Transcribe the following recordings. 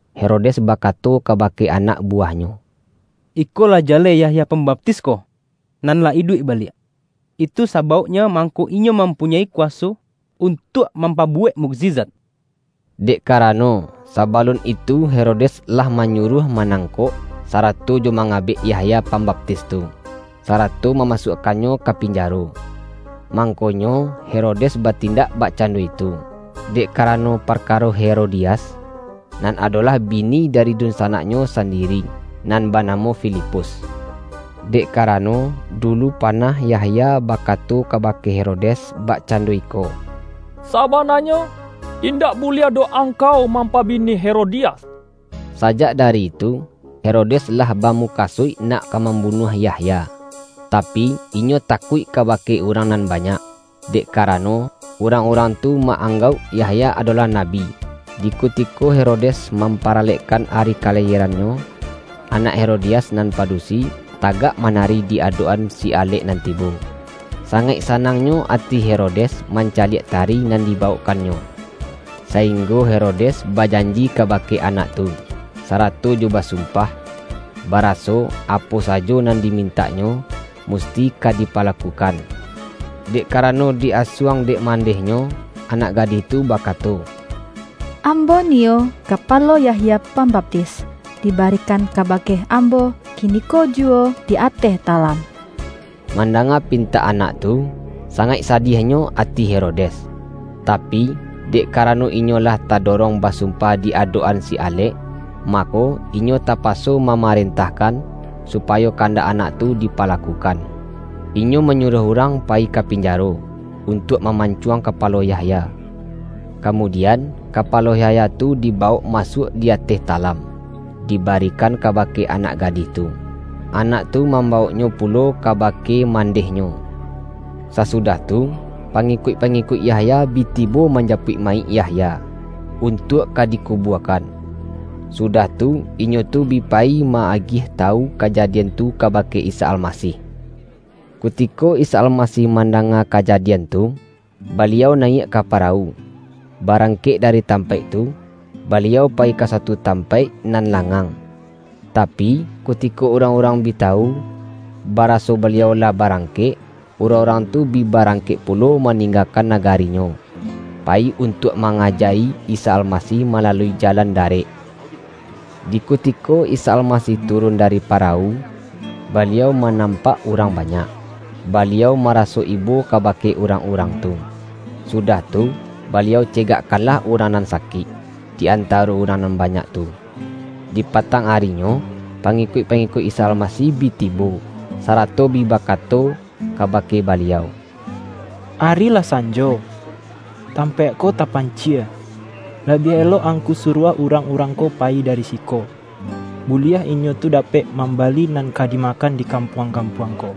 Herodes bakato kabake anak buwah-nyo.”Iko lah jaleh Yahya Pambaptis ko nan lah iduik baliak! ltu sabauknyo mangko Inyo mampunyoi kuwaso un-tuak mampabuwek mukjizat.” Dek karano, sabalun itu Herodes lah manyuruah manangkok, sarato jo mangabek Yahya Pambaptis tu, sarato mamasuakkannyo ka pinjaro. Mang-konyo Herodes batindak bakcando itu, dek karano parkaro Herodias, nan ado-lah bini dari dunsanaknyo sandiri nan banamo Filipus. Dek karano, dulu panah Yahya bakato kabake Herodes bakcando iko,”Sabananyo, indak bu-liah doh angkau mampabini Herodi-as!” Sajak dari itu, Herodes lah ba-mukasuik nak ka mambunuah Yahya, tapi, inyo takuik kabake urang nan ba-nyak, dek karano, urang-urang tu ma-anggauk Yahya adolah nabi. Di kutiko Herodes mamparalekkan ari kalayierannyo, anak Herodias nan padusi, tagak manari di adok-an si alek nan tibo. Sangaik sanangnyo ati Hero-des mancaliak tari nan dibawokkannyo, sainggo Herodes bajanji kabake anak tu, sarato jo basumpah, baraso, apo sajo nan dimintaknyo, musti ka dipalakukan. Dek karano di-asuang dek man-dehnyo, anak gadih tu bakato,”Ambo niyo kapalo Yahya Pambaptis, dibari-kan kabake ambo kiniko juwo di ateh talam!” Mandanga pintak anak tu, sangaik sadiahnyo ati Herodes. Tapi, dek ka-rano inyo lah tadorong basumpah di adok-an si alek, mako, inyo tapaso ma-marentahkan, supayo kandak anak tu dipalakukan. Inyo manyuruah urang payi ka pinjaro, untuak ma-mancuang kapalo Yahya. Kamudi-an, kapalo Yahya tu dibawok masuak di ateh talam, dibarikan kabake anak gadih tu. Anak tu mambawoknyo pu-lo kabake mandehnyo. Sasudah tu, pangikuik-pangikuik Yahya bi tibo manjapuik mayik Yahya, untuak ka dikubuakan. Sudah tu, inyo tu bi pa-yi ma-agiah tawu kajadian tu kabake Isa Almasih. Kutiko Isa Almasih mandanga ka-jadian tu, Baliau nayiak ka parawu, ba-rangkek dari tampaik tu, Baliau payi ka suatu tampaik nan langang. Tapi, ku-tiko urang-urang bi tawu, baraso Baliau lah barangkek, urang-urang tu bi ba-rangkek pulo maninggakan nagarinyo, payi untuak mangaja-i Isa Almasih malalui jalan darek. Di kutiko Isa Almasih turun dari parawu, Baliau ma-nampak urang banyak, Baliau maraso ibo kabake urang-urang tu. Sudah tu, Baliau cegakkanlah urang nan sakik, di antaro urang nan banyak tu. Di patang arinyo, pangikuik-pa-ngikuik Isa Almasih bi tibo, sarato bi bakato kabake Baliau,”Ari lah san-jo, tampaik ko tapancie. Labiah elok Angku suruah urang-urang ko payi dari siko, buliah inyo tu dapek mam-bali nan ka dimakan di kampuang-kampuang ko.”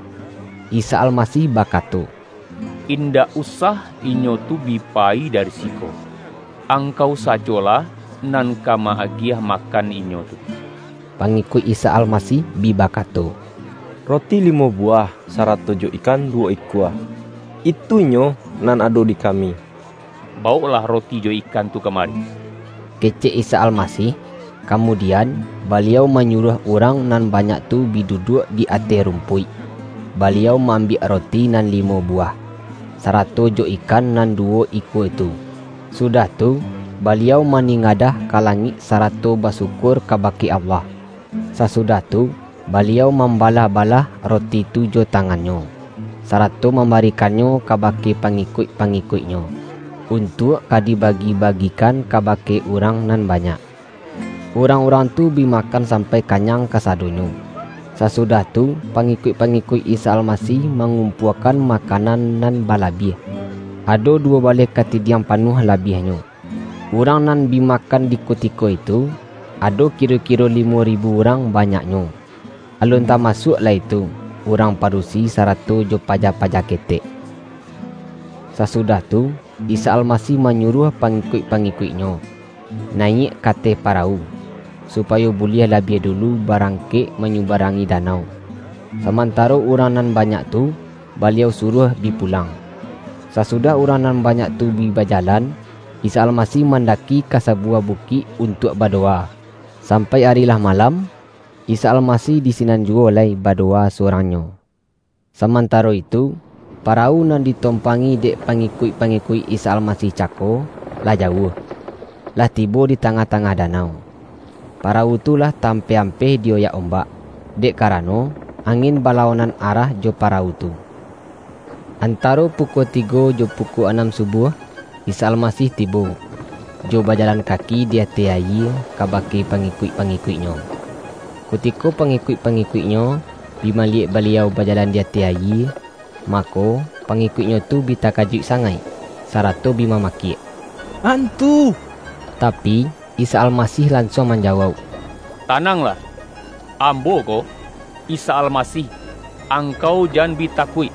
Isa Almasih bakato,”Indak usah inyo tu bi payi dari siko, angkau sajolah nan ka ma-agiah makan inyo tu.” Pangikuik Isa Almasih bi bakato,”Roti limo buwah, sarato jo ikan duwo ikua, itunyo nan ado di kami!” ”Bawoklah roti jo ikan tu kama-ri,” kecek Isa Almasih. Kamudian, Baliau manyuruah urang nan banyak tu bi duduak di ateh rumpuik. Baliau ma-ambiak roti nan limo buwah, sa-rato jo ikan nan duwo ikua tu, sudah tu, Baliau maningadah ka langik sa-rato basyukur kabake Allah. Sasudah tu, Baliau mambalah-balah roti tu jo tangan-Nyo, sarato mambarikannyo kabake pangikuik-pangikuik-Nyo, un-tuak ka dibagi-bagikan kabake urang nan banyak. Urang-urang tu bi ma-kan sampai kanyang kasadonyo. Sa-sudah tu, pangikuik-pangikuik Isa Almasih mangumpuakan makanan nan balabiah; ado duwo baleh kati-diang panuah labiahnyo. Urang nan bi makan di kutiko itu, ado kiro-kiro limo ribu urang banyaknyo, alun ta-masuak lai tu urang padusi sarato jo paja-paja ketek. Sasudah tu, Isa Almasih manyu-ruah pangikuik-pangikuik-Nyo, na-yiak ka ateh parawu, supayo buliah labiah dulu barangkek manyubarangi danau, samantaro urang nan banyak tu, Baliau suruah bi pulang. Sasu-dah urang nan banyak tu bi bajalan, Isa Almasih mandaki ka sabuwah bu-kik untuak badowa. Sampai ari lah malam, Isa Almasih di sinan juwo lai badowa surang-Nyo. Samantaro itu, parawu nan ditompangi dek pangi-kuik-pangikuik Isa Almasih cako, lah jauah, lah tibo di tangah-tangah da-nau. Parawu tu lah ta-ampeh-ampeh di-oyak ombak, dek karano, angin ba-lawanan arah jo parawu tu. Antaro pukua tigo jo pukua anam subuah, Isa Almasih tibo, jo bajalan kaki di ateh ayie kabake pangikuik-pangikuik-Nyo. Kutiko pangikuik-pangikuik-Nyo, bi maliyek Baliau bajalan di ateh ayie, mako, pangikuik-Nyo tu bi takajuik sa-ngaik, sarato bi mamakiak”Antu!” Tapi, Isa Almasih lansuang man-jawauk,”Tananglah! Ambo ko, Isa Almasih. Angkau jan bi takuik!”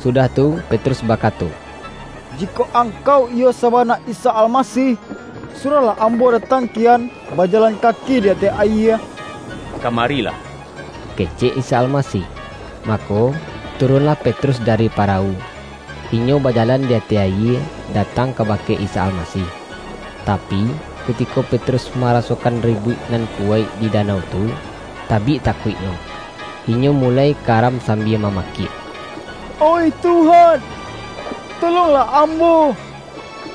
Sudah tu, Petrus bakato,”Jikok Angkau, iyo sabana Isa Almasih, su-ruahlah ambo datang kian bajalan ka-ki di ateh ayie.” ”Kamarilah,” kecek Isa Almasih. Mako, turunlah Petrus dari parawu, inyo bajalan di ateh ayie datang ka-bake Isa Almasih. Tapi, kutiko Petrus marasokan ribuik nan kuwaik di da-nau tu, tabik takuiknyo, inyo muloi ka-ram sambia mamakiak.”Oih Tuhan, tolonglah ambo!”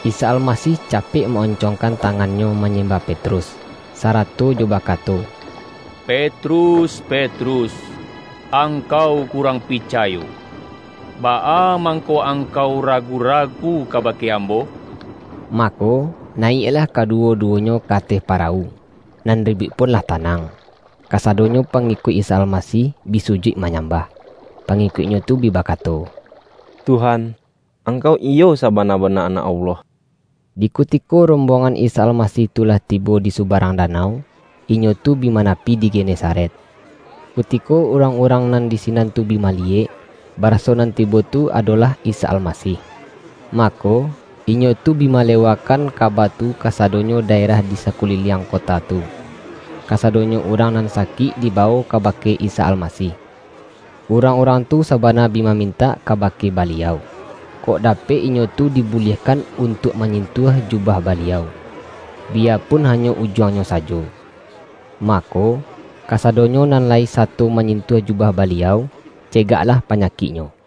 Isa Almasih capek ma-oncongkan tangan-Nyo manyemba Petrus, sara-to jo bakato,”Petrus, Petrus, angkau kurang picayo. Baa mangko angkau ragu-ragu kabake Ambo?” Mako, nayiaklah kaduwo-duwo-nyo ka ateh parawu, nan ribuik pun lah tanang. Kasadonyo pangikuik Isa Almasih bi sujuik manyambah. Pangi-kuik-Nyo tu bi bakato,”Tuhan, Angkau iyo sabana-bana Anak Allah!” Di kutiko rombongan Isa Almasih tu lah tibo di subarang danau, inyo tu bi manapi di Genesaret. Kutiko urang-urang nan di sinan tu bi ma-liyek, baraso nan tibo tu adolah Isa Almasih, mako, inyo tu bi malewakan kaba tu kasadonyo daerah di sakuli-liang kota tu. Kasadonyo urang nan sakik dibawok kabake Isa Almasih. Urang-urang tu sabana bi mamin-tak kabake Baliau, kok dapek inyo tu dibuliahkan untuak manyintuah jubah Baliau, biyapun hanyo ujuangnyo sa-jo. Mako, kasadonyo nan lai sato ma-nyintuah jubah Baliau, cegaklah pa-nyakik nyo.